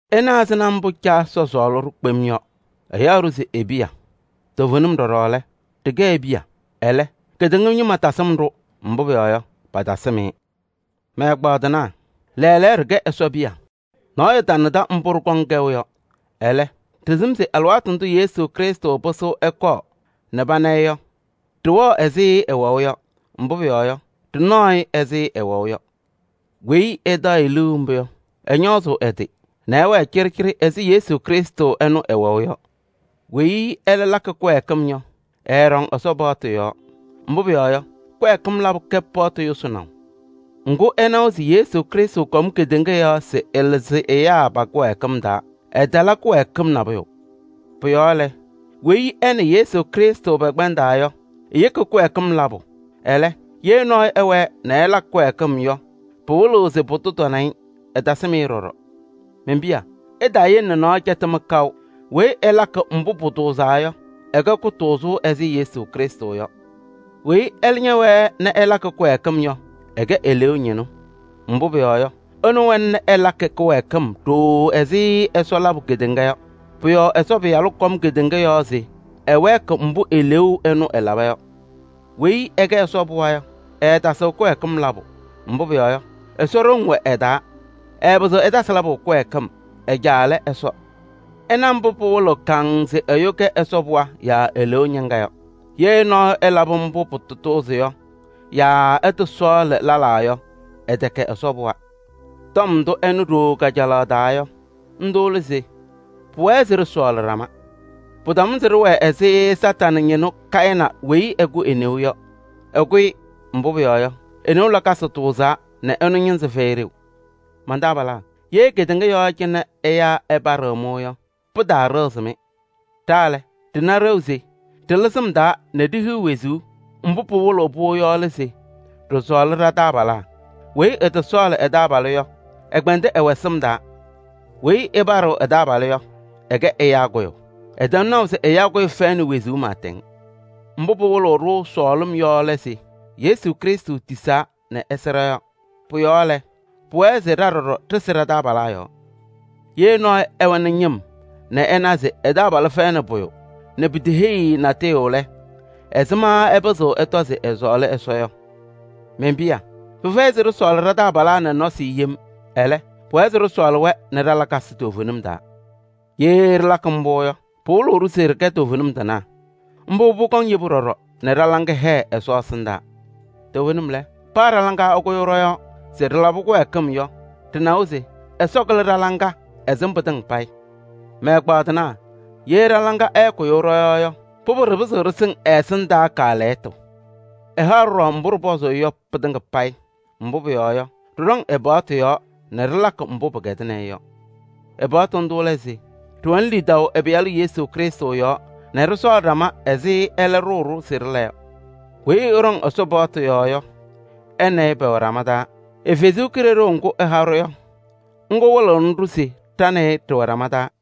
Ɩna ɛzɩma mbʋ Caa Ɛsɔ sɔɔlɩ-ɖʋ kpem yɔ: ɛyaɣ-ɖʋ se e-piya. Toovenim ɖɔɖɔ lɛ, ɖɩkɛ e-piya. Ɛlɛ, kedeŋa ñɩma tasɩm-ɖʋ, mbʋ pʋyɔɔ yɔ, patasɩm-ɩ. Mɛ-ɛgbaadɩnaa! Lɛɛlɛɛyɔ ɖɩkɛ Ɛsɔ piya. Nɔɔyʋ tanadɩ mbʋ ɖɩkɔŋ kɛʋ yɔ. Ɛlɛ, ɖɩsɩm se alɩwaatʋ ndʋ Yesu Krɩstʋ pɩsɩɣ ɛkɔɔ nɛ pana-ɩ yɔ, ɖɩwɛɣ ɛzɩ ɛwɛʋ yɔ, mbʋ pʋyɔɔ yɔ, ɖɩnaɣ-ɩ ɛzɩ ɛwɛʋ yɔ. Weyi ɛtaɣ-ɩ liu mbʋ yɔ, ɛñɔɔzʋʋ ɛ-tɩ nɛ ɛwɛɛ cɩɖɩcɩɖɩ ɛzɩ Yesu Krɩstʋ ɛnʋ ɛwɛʋ yɔ. Weyi ɛlɛ lakɩ kɩwɛɛkɩm yɔ, ɛɛɖɔŋ Ɛsɔ paɣtʋ yɔɔ. Mbʋ pʋyɔɔ yɔ, kɩwɛɛkɩm labʋ kɛ paɣtʋ yʋsɩnaʋ. Ŋgʋ ɩnawa se Yesu Krɩstʋ kɔm kedeŋa yɔɔ se ɛlɩzɩ ɛyaa pa-kɩwɛɛkɩm taa, ɛtala kɩwɛɛkɩm nabʋyʋ. Pʋ-yɔɔ lɛ, weyi ɛ nɛ Yesu Krɩstʋ pɛkpɛndaa yɔ, eyeki kɩwɛɛkɩm labʋ. Ɛlɛ, ye nɔɔyʋ ɛwɛɛ nɛ ɛlakɩ kɩwɛɛkɩm yɔ, pɩwɩlɩɣ se pʋdʋ tana-ɩ, ɛtasɩm-ɩ ɖɔɖɔ. Men-piya! Ɩtaayele nɛ nɔɔyʋ cɛtɩ-mɩ kaʋ! Weyi ɛlakɩ mbʋ pʋtʋʋzaa yɔ, ɛkɛ kʋtʋʋzʋ ɛzɩ Yesu Krɩstʋ yɔ. Weyi ɛlɛ ñɛwɛɛ nɛ ɛlakɩ kɩwɛɛkɩm yɔ, ɛkɛ eleeu ñɩnʋ. Mbʋ pʋyɔɔ yɔ, ɛnʋ wɛna nɛ ɛlakɩ kɩwɛɛkɩm ɖooo ɛzɩ Ɛsɔ labʋ kedeŋa yɔ. Pʋ-yɔɔ Ɛsɔ Pɩyalʋ kɔm kedeŋa yɔɔ se ɛwɛɛkɩ mbʋ eleeu ɛnʋ ɛlaba yɔ. Weyi ɛkɛ Ɛsɔ pɩɣa yɔ, ɛɛtasɩɣ kɩwɛɛkɩm labʋ. Mbʋ pʋyɔɔ yɔ, Ɛsɔ ɖoŋ wɛ ɛ-taa. Ɛɛpɩzɩɣ ɛtasɩ labʋ kɩwɛɛkɩm: ɛ-Caa lɛ Ɛsɔ. Ɩna mbʋ pɩwɩlɩɣ kaŋŋ se ɛyʋ kɛ Ɛsɔ pɩɣa yaa eleeu ñɩŋga yɔ: ye nɔɔyʋ ɛlabɩ mbʋ pɩtatʋʋzɩ yɔ yaa ɛtɔsɔɔlɩ lɛlaa yɔ, ɛtɛkɛ Ɛsɔ pɩɣa. Tɔm ndʋ ɩnɩ ɖooo kajalaɣ taa yɔ, ndʋ lɛ se: pʋwɛɛ se ɖɩsɔɔlɩ ɖama. Pɩtamʋnɩ se ɖɩwɛɛ ɛzɩ Kañadʋ Satanɩ ñɩnʋ Kayɩnɩ weyi ɛkʋ e-neu yɔ. Ɛkʋ-ɩ, mbʋ pʋyɔɔ yɔ, e-neu lakasɩ tʋʋzaa nɛ ɛnʋ ñɩnzɩ fɛyɩ ɖeu. Man-taabalaa! Ye kedeŋa yɔɔ cɩnɛ ɛyaa ɛpaɖɩɣ-mɩ yɔ, pɩtaaɖɩɣzɩ-mɩ. Ɖa lɛ, ɖɩna ɖeu se ɖɩlɩ sɩm taa nɛ ɖihiɣ wezuu, mbʋ pɩwɩlɩɣ-pʋ yɔ lɛ se ɖɩsɔɔlɩ ɖa-taabalaa. Weyi ɛtɔsɔɔlɩ ɛ-taabalʋ yɔ, ɛkpɛndɩ ɛwɛ sɩm taa. Weyi ɛpaɖɩɣ ɛ-taabalʋ yɔ, ɛkɛ ɛyaa kʋyʋ. Ɩtɛm naʋ se ɛyaa kʋyʋ fɛyɩnɩ wezuu pɩɩtɛŋ. Mbʋ pɩwɩlɩɣ-ɖʋ sɔɔlɩm yɔ lɛ se: Yesu Krɩstʋ tisaa nɛ ɛsɩ ɖɔ-yɔɔ. Pʋ-yɔɔ lɛ, pʋwɛɛ se ɖa ɖɔɖɔ ɖɩsɩ ɖa-taabalaa yɔɔ. Ye nɔɔyʋ ɛwɛnɩ ñɩm nɛ ɛna se ɛ-taabalʋ fɛyɩnɩ pʋyʋ nɛ piteheyi-i natʋyʋ lɛ, ɛzɩma ɛpɩzɩɣ ɛtɔ se ɛsɔɔlɩ Ɛsɔ yɔ? Men-piya! Pɩfɛyɩ se ɖɩsɔɔlɩ ɖa-taabalaa nɛ nɔsɩ yem, ɛlɛ, pʋwɛɛ se ɖɩsɔɔlɩ-wɛ nɛ ɖa-lakasɩ toovenim taa. Ye ɖɩlakɩ mbʋ yɔ, pɩwɩlɩɣ-ɖʋ se ɖɩkɛ toovenim tɩnaa. Mbʋ kɔŋnɩ yebu ɖɔɖɔ nɛ ɖa-laŋa hɛɛ Ɛsɔ ɛsɩndaa. Toovenim lɛ, paa ɖa-laŋa ɛkʋyʋʋ ɖɔ-yɔɔ se ɖɩlabɩ kɩwɛɛkɩm yɔ, ɖɩnawa se Ɛsɔ kɩlɩ ɖa-laŋa, ɛsɩm pɩtɩŋa payɩ. Mɛ-ɛgbaadɩnaa! Ye ɖa-laŋa ɛɛkʋyʋʋ ɖɔ-yɔɔ yɔ, pʋbʋ ɖɩpɩzɩɣ ɖɩsɩŋ ɛ-ɛsɩndaa kaalɛyɩtʋ. Ɛhaɣ-ɖʋ ɖɔɖɔ mbʋ ɖɩpɔzʋʋ-ɩ yɔ pɩtɩŋa payɩ, mbʋ pʋyɔɔ yɔ, ɖɩɖɔŋ ɛ-paɣtʋ yɔɔ nɛ ɖɩlakɩ mbʋ pɩkɛdɩnɩ-ɩ yɔ. Ɛ-paɣtʋ ndʋ lɛ se: ɖɩwɛnɩ lidaʋ ɛ-Pɩyalʋ Yesu Krɩstʋ yɔɔ nɛ ɖɩsɔɔlɩ ɖama ɛzɩ ɛlɛ ɖʋʋ-ɖʋ se ɖɩla yɔ. Weyi ɛɖɔŋ Ɛsɔ paɣtʋ yɔɔ yɔ, ɛ nɛ ɩ pɛwɛ ɖama taa. Ɛ-Kalɩzaɣ ŋga ɛha-ɖʋ yɔ, ŋga wɩlɩɣnɩ-ɖʋ se ɖa nɛ ɩ ɖɩwɛ ɖama taa.